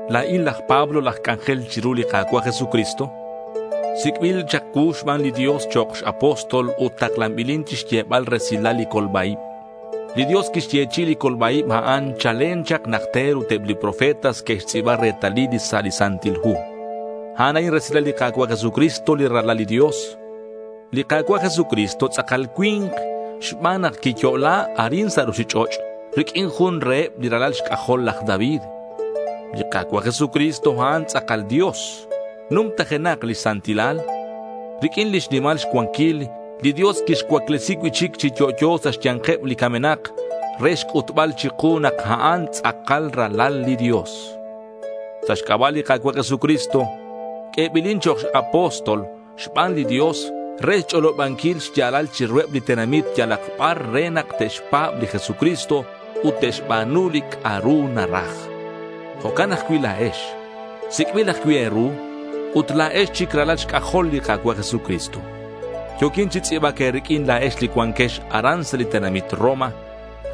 La̱in laj Pablo laj c'anjel chiru li Ka̱cua' Jesucristo. Sic'bil chak cuu xban li Dios chok' x-apóstol ut taklanbilin chixyebal resilal li colba-ib. Li Dios quixyechi'i li colba-ib a'in chalen chak najter ut eb li profetas que'xtz'i̱ba retalil sa' li Santil Hu. A'an a'in resilal li Ka̱cua' Jesucristo li Ralal li Dios. Li Ka̱cua' Jesucristo tz'akal cui̱nk xban nak quiyo'la arin sa' ruchich'och' riq'uin jun reheb li ralal xc'ajol laj David. Li Ka̱cua' Jesucristo a'an tz'akal Dios. Numtajenak lix santilal. Riq'uin lix nimal xcuanquil, li Dios quixcuaclesi cui'chic chi yo'yo sa' xya̱nkeb li camenak re xc'utbal chiku nak a'an tz'akal Ralal li Dios. Sa' xc'aba' li Ka̱cua' Jesucristo q'uebilin chok' apóstol xban li Dios re xch'olobanquil xya̱lal chiruheb li tenamit yalak bar re nak te'xpa̱b li Jesucristo ut te'xba̱nu li c'a'ru naraj. Jo'can ajcui' la̱ex sic'bil ajcui' e̱ru, ut la̱ex chic ralal xc'ajol li Ka̱cua' Jesucristo. Yo̱quin chi tz'i̱bac e̱riq'uin la̱ex li cuanquex aran sa' li tenamit Roma.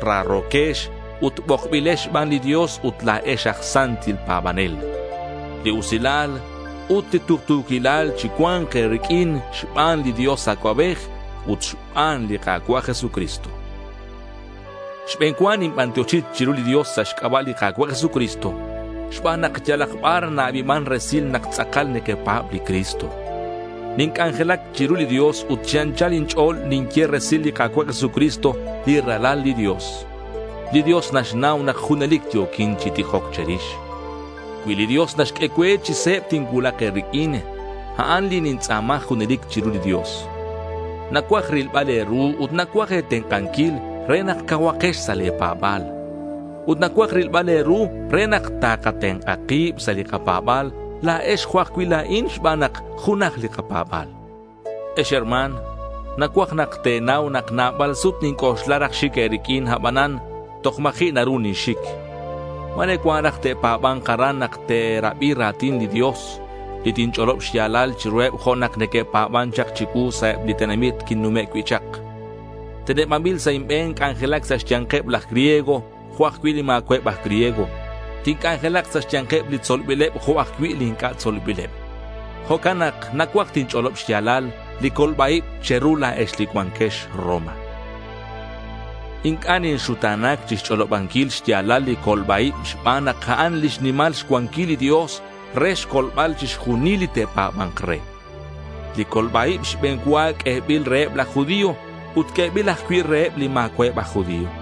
Raro̱quex ut bokbilex xban li Dios ut la̱ex aj santil pa̱banel. Li usilal ut li tuktu̱quilal chi cua̱nc e̱riq'uin xban li Dios Acuabej ut xban li Ka̱cua' Jesucristo. Xbe̱n cua ninbantioxi chiru li Dios sa' xc'aba' li Ka̱cua' Jesucristo xban nak yalak bar na-abiman resil nak tz'akal nequepa̱b li Cristo. Ninc'anjelac chiru li Dios ut chi anchal inch'o̱l ninye resil li Ka̱cua' Jesucristo li Ralal li Dios. Li Dios naxnau nak junelic yo̱quin chi tijoc che̱rix. Cui li Dios naxq'ue cue, chi se̱b tincuulak e̱riq'uin. A'an li nintz'a̱ma junelic chiru li Dios. Nacuaj rilbal e̱ru ut nacuaj e̱tenk'anquil re nak cauhakex sa' le̱ pa̱ba̱l. Ut nacuaj rilbal e̱ru re nak takatenk'a kib sa' li kapa̱ba̱l, la̱ex jo' ajcui' la̱in, xban nak junaj li kapa̱ba̱l. Ex herma̱n, nacuaj nak te̱nau nak nabal sut ninc'oxla raj xic e̱riq'uin, abanan toj ma̱ji' naru ninxic. Ma̱re cuan raj te'pa̱ba̱nk aran nak te'rabi ra̱tin li Dios li tinch'olob xya̱lal chiruheb jo' nak que'pa̱ban chak chicuu sa' eb li tenamit quinnume' cui' chak. Tenebanbil sa' inbe̱n c'anjelac sa' xya̱nkeb laj griego jo' ajcui' li ma̱cua'eb aj griego. Tinc'anjelak sa' xya̱nkeb li tzolbileb jo' ajcui' li inc'a' tzolbileb. Jo'can nak nacuaj tinch'olob xya̱lal li colba-ib che̱ru la̱ex li cuanquex Roma. Inc'a' ninxuta̱nac chixch'olobanquil xya̱lal li colba-ib xban nak a'an lix nimal xcuanquil li Dios re xcolbal chixjunil li te'pa̱ba̱nk re. Li colba-ib xbe̱n cua q'uebil reheb laj judío ut q'uebil ajcui' reheb li ma̱cua'eb aj judío.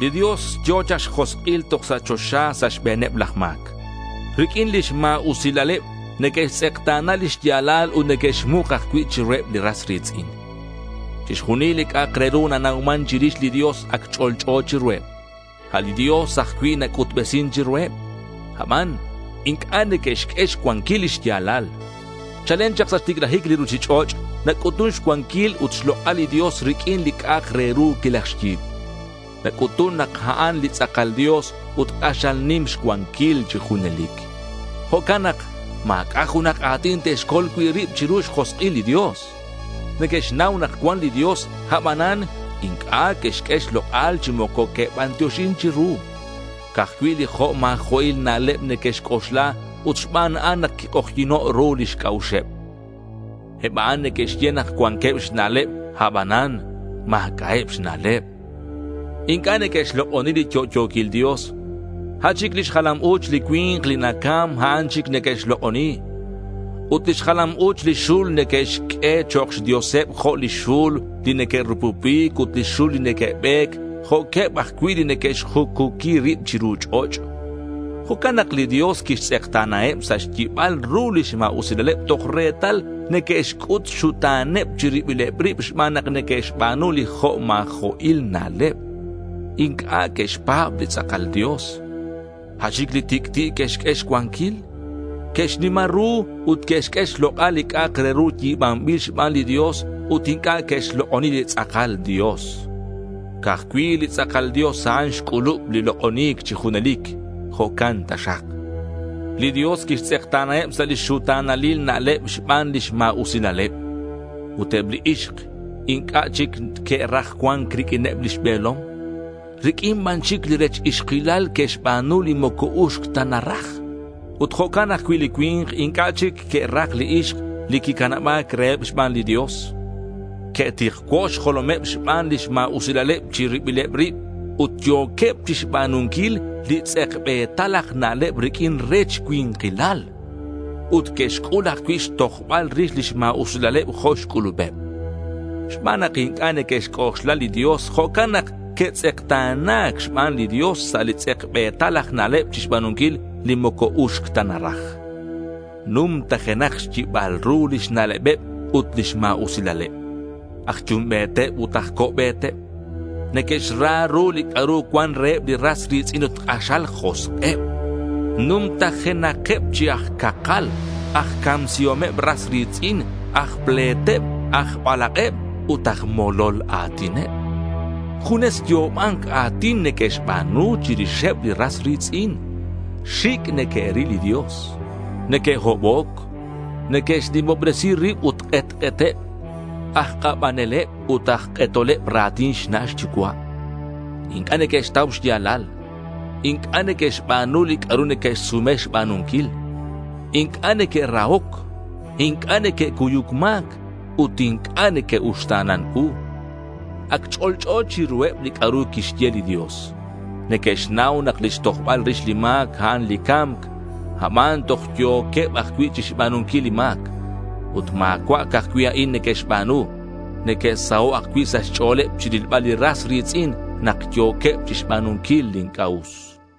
Li Dios yo̱ chak xjosk'il toj sa' choxa sa' xbe̱neb laj ma̱c. Riq'uin lix ma̱usilaleb neque'xtz'ekta̱na lix ya̱lal ut neque'xmuk ajcui' chiruheb li ras ri̱tz'in. Chixjunil li c'a'ak re ru nanauman chirix li Dios, ac ch'olch'o chiruheb. A' li Dios ajcui' quic'utbesin chiruheb. Aban inc'a' neque'xq'ue xcuanquil li xya̱lal. Chalen chak sa' xticlajic li ruchich'och' nac'utun xcuanquil ut xlok'al li Dios riq'uin li c'a'ak re ru quilajxyi̱b. Nac'utun nak a'an li tz'akal Dios ut k'axal nim xcuanquil chi junelic. Jo'can nak ma̱c'a' junak a̱tin te'xcol cui' rib chiru xjosk'il li Dios. Neque'xnau nak cuan li Dios, aban inc'a' que'xq'ue xlok'al chi moco que'bantioxin chiru. Ca'aj cui' li jo' ma̱jo'il na'leb neque'xc'oxla ut xban a'an nak quik'ojyi̱no' ru lix c'a'uxeb. Eb a'an neque'xye nak cuanqueb xna'leb abanan ma̱c'a'eb xna'leb. Inc'a' neque'xlok'oni li yo'yo̱quil Dios. A' chic lix jalam u̱ch li cui̱nk li nacam, a'an chic neque'xlok'oni. Ut lix jalam u̱ch li xul neque'xq'ue chok' xdioseb jo' li xul li neque'rupupic ut li xul li neque'be̱c, jo'queb ajcui' li neque'xjucuqui rib chiru ch'och'. Jo'can nak li Dios quixtz'ekta̱naheb sa' xyibal ru lix ma̱usilaleb toj retal neque'xc'ut xxuta̱neb chi ribileb rib xban nak neque'xba̱nu li jo' ma̱jo'il na'leb. Inc'a' que'xpa̱b li tz'akal Dios. A' chic li tic'ti' que'xq'ue xcuanquil. Que'xnima ru ut que'xq'ue xlok'al li c'a'ak re ru yi̱banbil xban li Dios ut inc'a' que'xlok'oni li tz'akal Dios. Ca'aj cui' li tz'akal Dios a'an xc'ulub li lok'oni̱c chi junelic. Jo'can taxak. Li Dios quixtz'ekta̱naheb sa' lix xuta̱nalil na'leb xban lix ma̱usilaleb. Ut eb li ixk inc'a' chic que'raj cua̱nc riq'uineb lix be̱lom. Riq'uin ban chic li rech ixkilal que'xba̱nu li moco uxc ta naraj. Ut jo'can ajcui' li cui̱nk inc'a' chic que'raj li ixk li quicanaba̱c reheb xban li Dios. Que'tikcuo' xjolomeb xban lix ma̱usilaleb chi ribileb rib ut yo̱queb chixba̱nunquil li tz'ekbe̱tal aj na'leb riq'uin rech cui̱nkilal. Ut que'xc'ul ajcui' xtojbal rix lix ma̱usilaleb jo' xc'ulubeb. Xban nak inc'a' neque'xc'oxla li Dios, jo'can nak que'tz'ekta̱na̱c xban li Dios sa' li tz'ekbe̱tal aj na'leb chixba̱nunquil li moco uxc ta naraj. Numtajenakeb xyibal ru lix na'lebeb ut lix ma̱usilaleb. Aj yumbe̱teb ut aj co'be̱teb. Neque'xra ru li c'a'ru cuan reheb li ras ri̱tz'in ut k'axal josk'eb. Numtajenakeb chi aj cakal, aj camsihomeb ras ri̱tz'in, aj ple̱teb, aj balak'eb ut aj molol a̱tineb. Junes yo'oba̱nc a̱tin neque'xba̱nu chirixeb li ras ri̱tz'in. Xic' neque'ril li Dios. Neque'hoboc. Neque'xnimobresi rib ut k'etk'eteb. Aj k'abaneleb ut aj k'etoleb ra̱tin xna' xyucua'. Inc'a' neque'xtau xya̱lal. Inc'a' neque'xba̱nu li c'a'ru neque'xsume xba̱nunquil. Inc'a' neque'rahoc. Inc'a' neque'cuyuc ma̱c, ut inc'a' neque'uxta̱nan u. Ac ch'olch'o chiruheb li c'a'ru quixye li Dios. Neque'xnau nak lix tojbal rix li ma̱c, a'an li ca̱mc. Aban toj yo̱queb ajcui' chixba̱nunquil li ma̱c. Ut ma̱cua' ca'aj cui' a'an neque'xba̱nu. Neque'saho' ajcui' sa' xch'o̱l chirilbaleb li ras ri̱tz'in nak yo̱queb chixba̱nunquil li inc'a' us.